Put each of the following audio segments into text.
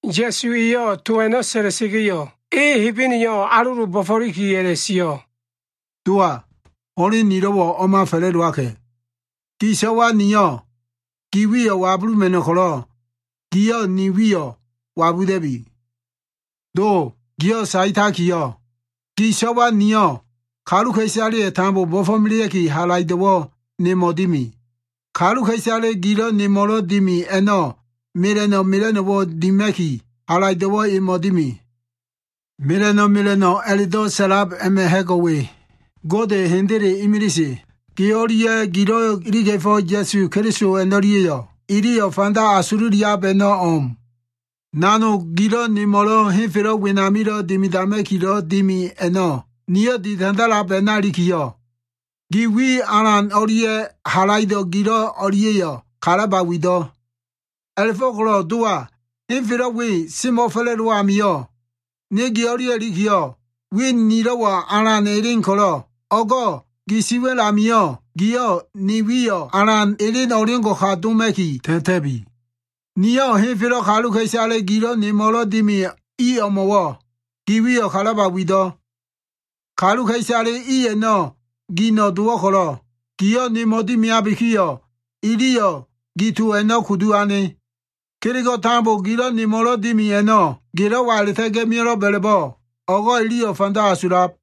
Ya꞉suwa꞉yo꞉ to a꞉no꞉ sa꞉la꞉sa꞉ga꞉yo꞉, e Hebeneyo꞉ alolo bo꞉fo꞉liki a꞉la꞉sio꞉, “Dowa, ho꞉len nilo꞉wo꞉ o꞉ma fa꞉la꞉dowaka꞉. Gi so꞉wa niyo꞉ gi wiyo꞉ wabuluma꞉no꞉ ko꞉lo꞉, giyo꞉ ni wiyo꞉ wabuda꞉bi. Do, giyo꞉ saetakiyo꞉, gi so꞉wa niyo꞉ kaluka꞉isaleyo꞉ tambo bo꞉fo꞉melea꞉kiyo꞉, halaido꞉wo꞉ nemo꞉ dimi. Kaluka꞉isale gilo꞉ nemo꞉lo꞉ dimi a꞉no꞉ mela꞉no꞉ mela꞉no꞉wo꞉ dima꞉ki, halaido꞉wo꞉ emo꞉ dimi. Mela꞉no꞉ mela꞉no꞉ a꞉la꞉do꞉ sa꞉lab a꞉ma꞉ ha꞉go꞉ we. Gode Hendele imilise, Ge o꞉lia꞉ gilo꞉ iliga꞉fo꞉ Ya꞉su Keliso a꞉no꞉lia꞉yo꞉ ililo꞉ fanda asululiab a꞉no꞉ o꞉m. Nanogo꞉ gilo꞉ nemo꞉lo꞉ henfelo꞉ wenamilo꞉ dimidama꞉kilo꞉ dimi a꞉no꞉ niyo꞉ ditandalab a꞉na ilikiyo꞉, gi wi alan o꞉lia꞉ halaido꞉ gilo꞉ o꞉lia꞉yo꞉ kalaba wido꞉. A꞉la꞉fo꞉ko꞉lo꞉ Dowa, henfelo꞉ we semo꞉fa꞉la꞉dowo꞉ amio꞉, ne ge o꞉lia꞉ ilikiyo꞉, wi nilo꞉wo꞉ alan elen ko꞉lo꞉, o꞉go꞉ gi siwa꞉l amio꞉ giyo꞉ ne wiyo꞉ alan elen o꞉ngo꞉ka doma꞉ki ta꞉ta꞉bi. “Niyo꞉ henfelo꞉ kaluka꞉isale gilo꞉ nemo꞉lo꞉ dimi i o꞉mo꞉wo꞉ gi wiyo꞉ kalaba wido꞉. Kaluka꞉isale i a꞉no꞉ gino꞉ dowo꞉ ko꞉lo꞉, giyo꞉ nemo꞉ dimiabikiyo꞉, iliyo꞉ gi to a꞉no꞉ kudu ane. Kelego꞉ tambo gilo꞉ nemo꞉lo꞉ dimi a꞉no꞉ gelo꞉wa a꞉la꞉ta꞉ga꞉ mio꞉lo꞉b a꞉la꞉bo꞉, o꞉go꞉ iliyo꞉ fanda asulab.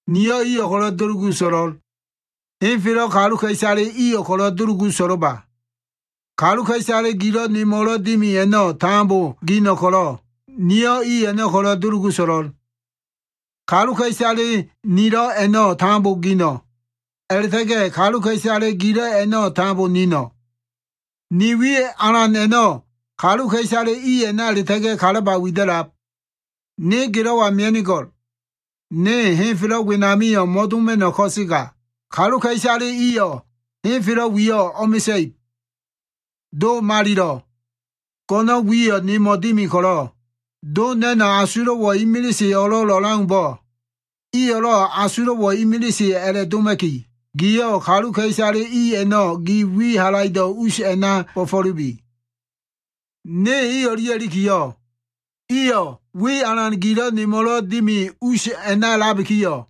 Niyo꞉ iyo꞉ ko꞉lo꞉ dulugu so꞉lo꞉l. Henfelo꞉ kaluka꞉isale iyo꞉ ko꞉lo꞉ dulugu so꞉lo꞉ba. Kaluka꞉isale gilo꞉ nemo꞉lo꞉ dimi a꞉no꞉ tambo gino꞉ ko꞉lo꞉, niyo꞉ i a꞉no꞉ ko꞉lo꞉ dulugu so꞉lo꞉l. Kaluka꞉isale nilo꞉ a꞉no꞉ tambo gino꞉. A꞉la꞉ta꞉ga꞉ kaluka꞉isale gilo꞉ a꞉no꞉ tambo nino꞉. Ni wi alan a꞉no꞉ kaluka꞉isale i a꞉na a꞉la꞉ta꞉ga꞉ kalaba wida꞉lab. Ne gelo꞉wa mia꞉nigo꞉l. Ne henfelo꞉ wenamio꞉ mo꞉doma꞉no꞉ ko꞉sega, kaluka꞉isale iyo꞉ henfelo꞉ wiyo꞉ o꞉mesa꞉ib. Do Malilo꞉, go꞉no꞉n wiyo꞉ nemo꞉ dimi ko꞉lo꞉, Do na꞉no꞉ asulo꞉wo꞉ imilise o꞉lo꞉l o꞉leaumbo꞉, iyo꞉lo꞉ asulo꞉wo꞉ imilise a꞉la꞉doma꞉ki, giyo꞉ kaluka꞉isale i a꞉no꞉ gi wi halaido꞉ us a꞉na bo꞉fo꞉lubi. Ne i o꞉lia꞉ ilikiyo꞉, iyo꞉ wi alan gilo꞉ nemo꞉lo꞉ dimi us a꞉na a꞉labikiyo꞉,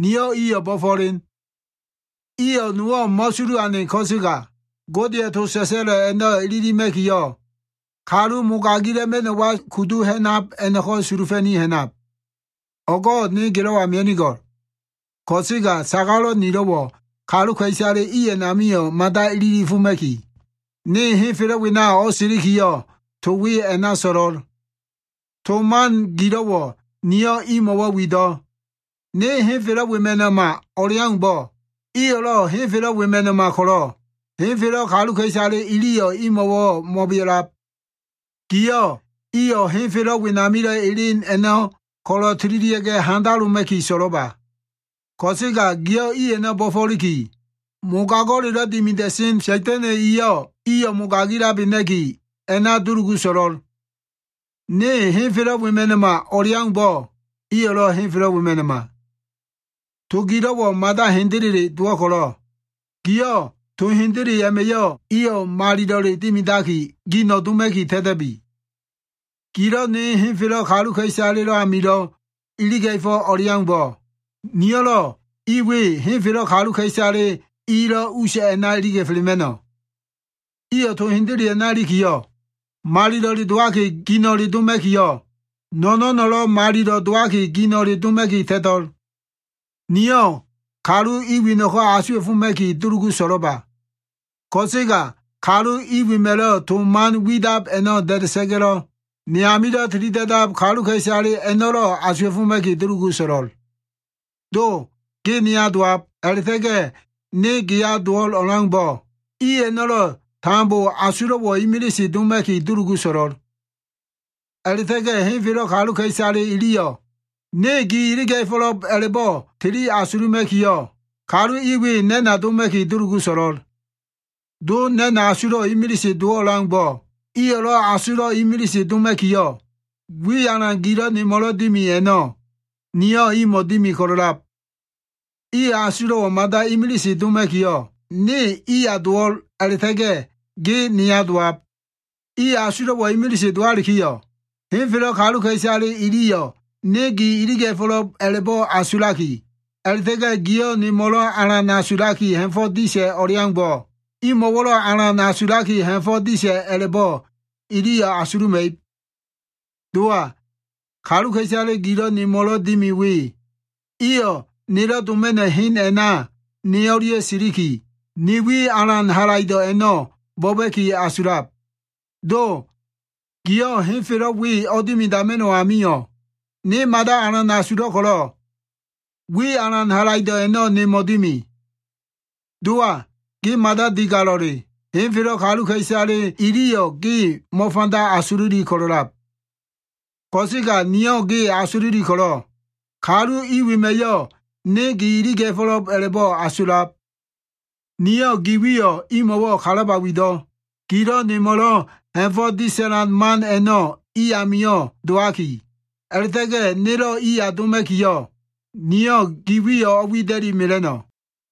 niyo꞉ iyo꞉ bo꞉fo꞉len. Iyo꞉ nowo꞉ mo꞉sulu ane ko꞉sega, Godeya꞉ to sa꞉sa꞉lo꞉ a꞉no꞉ ililima꞉kiyo꞉, kalulo꞉ mogagila꞉ma꞉no꞉wa kudu ha꞉nab a꞉no꞉ko꞉ sulufa꞉ni ha꞉nab. “O꞉go꞉ ne gelo꞉wa mia꞉nigo꞉l. Ko꞉sega sagalo꞉ nilo꞉wo꞉ kaluka꞉isale i a꞉namio꞉ mada ililifoma꞉ki, ne henfelo꞉ wena o꞉silikiyo꞉, to we a꞉na so꞉lo꞉l. To man gilo꞉wo꞉ niyo꞉ imo꞉wo꞉ wido꞉. Ne henfelo꞉ wema꞉no꞉ma o꞉leaumbo꞉, iyo꞉lo꞉ henfelo꞉ wema꞉no꞉ma ko꞉lo꞉, henfelo꞉ kaluka꞉isale iliyo꞉ imo꞉wo꞉ mo꞉bea꞉lab. Giyo꞉ iyo꞉ henfelo꞉ wenamilo꞉ elen a꞉no꞉ ko꞉lo꞉ tililia꞉ga꞉ handaloma꞉ki so꞉lo꞉ba. Ko꞉sega giyo꞉ i a꞉no꞉ bo꞉fo꞉liki, mogago꞉lelo꞉ dimida꞉sen Sa꞉da꞉na꞉ eyo꞉ iyo꞉ mogagilabena꞉ki a꞉na dulugu so꞉lo꞉l. Ne henfelo꞉ wema꞉no꞉ma o꞉leaumbo꞉, iyo꞉lo꞉ henfelo꞉ wema꞉no꞉ma. To gilo꞉wo꞉ mada hendele dowo꞉ ko꞉lo꞉, giyo꞉ to hendele a꞉ma꞉yo꞉ iyo꞉ malilo꞉le dimidaki, gino꞉ doma꞉ki ta꞉ta꞉bi. Gilo꞉ ne henfelo꞉ kaluka꞉isalelo꞉ amilo꞉ iliga꞉fo꞉ o꞉leaumbo꞉, niyo꞉lo꞉ i we henfelo꞉ kaluka꞉isale ilo꞉ us a꞉na iliga꞉felema꞉no꞉. Iyo꞉ to hendele a꞉na ilikiyo꞉, malilo꞉le dowaki gino꞉le doma꞉kiyo꞉, no꞉no꞉no꞉lo꞉ malilo꞉ dowaki gino꞉le doma꞉ki ta꞉to꞉l. “Niyo꞉ kalu i weno꞉ko꞉ asuwa꞉foma꞉ki dulugu so꞉lo꞉ba. Ko꞉sega kalu i wema꞉lo꞉ to man widab a꞉no꞉ da꞉da꞉sa꞉ga꞉lo꞉ ne amilo꞉ tilida꞉dab kaluka꞉isale a꞉no꞉lo꞉ asuwa꞉foma꞉ki dulugu so꞉lo꞉l. Do ge neya dowabilo꞉, ne geya dowo꞉l o꞉leaumbo꞉, i a꞉no꞉lo꞉ tambo asulo꞉wo꞉ imilise doma꞉ki dulugu so꞉lo꞉l. A꞉la꞉ta꞉ga꞉ henfelo꞉ kaluka꞉isale iliyo꞉ ne gi iliga꞉fo꞉lo꞉b a꞉la꞉bo꞉ tili asuluma꞉kiyo꞉, kalu i we na꞉na doma꞉ki dulugu so꞉lo꞉l. Do na꞉no꞉ asulo꞉wo꞉ imilise dowo꞉ o꞉leaumbo꞉, iyo꞉lo꞉ asulo꞉ imilise doma꞉kiyo꞉, wi alan gilo꞉ nemo꞉lo꞉ dimi a꞉no꞉, niyo꞉ imo꞉ dimi ko꞉lo꞉lab. Iyo꞉ asulo꞉wo꞉ mada imilise doma꞉kiyo꞉, ne iya dowo꞉l a꞉la꞉ta꞉ga꞉ ge neya dowab. Iyo꞉ asulo꞉wo꞉ imilise dowalikiyo꞉, henfelo꞉ kaluka꞉isale iliyo꞉ ne gi iliga꞉fo꞉lo꞉b a꞉la꞉bo꞉ asulaki, a꞉la꞉ta꞉ga꞉ giyo꞉ nelo꞉ alan asulaki ha꞉fo꞉ disa꞉ o꞉leaumbo꞉, giyo꞉ iyo꞉lo꞉ alan asulaki, ha꞉fo꞉ disa꞉ a꞉la꞉bo꞉ iliyo꞉ asuluma꞉ib. “Dowa, kaluka꞉isale gilo꞉ nemo꞉lo꞉ dimi we, iyo꞉ nelo꞉ doma꞉no꞉ hen a꞉na ne o꞉lia꞉ siliki, ni wi alan halaido꞉ a꞉no꞉ bo꞉ba꞉ki asulab. Do giyo꞉ henfelo꞉ we o꞉dimidama꞉no꞉ amio꞉, ne mada alan asulo꞉ ko꞉lo꞉, wi alan halaido꞉ a꞉no꞉ nemo꞉ dimi. Dowa, ge mada digalo꞉le. Henfelo꞉ kaluka꞉isale iliyo꞉ ge mo꞉fanda asululi ko꞉lo꞉lab. Ko꞉sega niyo꞉ ge asululi ko꞉lo꞉ kalu i wema꞉yo꞉ ne gi iliga꞉fo꞉lo꞉b a꞉la꞉bo꞉ asulab. Niyo꞉ gi wiyo꞉ imo꞉wo꞉ kalaba wido꞉. Gilo꞉ nemo꞉lo꞉ ha꞉fo꞉ disa꞉lan man a꞉no꞉ i amio꞉ dowaki, a꞉la꞉ta꞉ga꞉ nelo꞉ iya doma꞉kiyo꞉, niyo꞉ gi wiyo꞉ o꞉wida꞉li mela꞉no꞉.”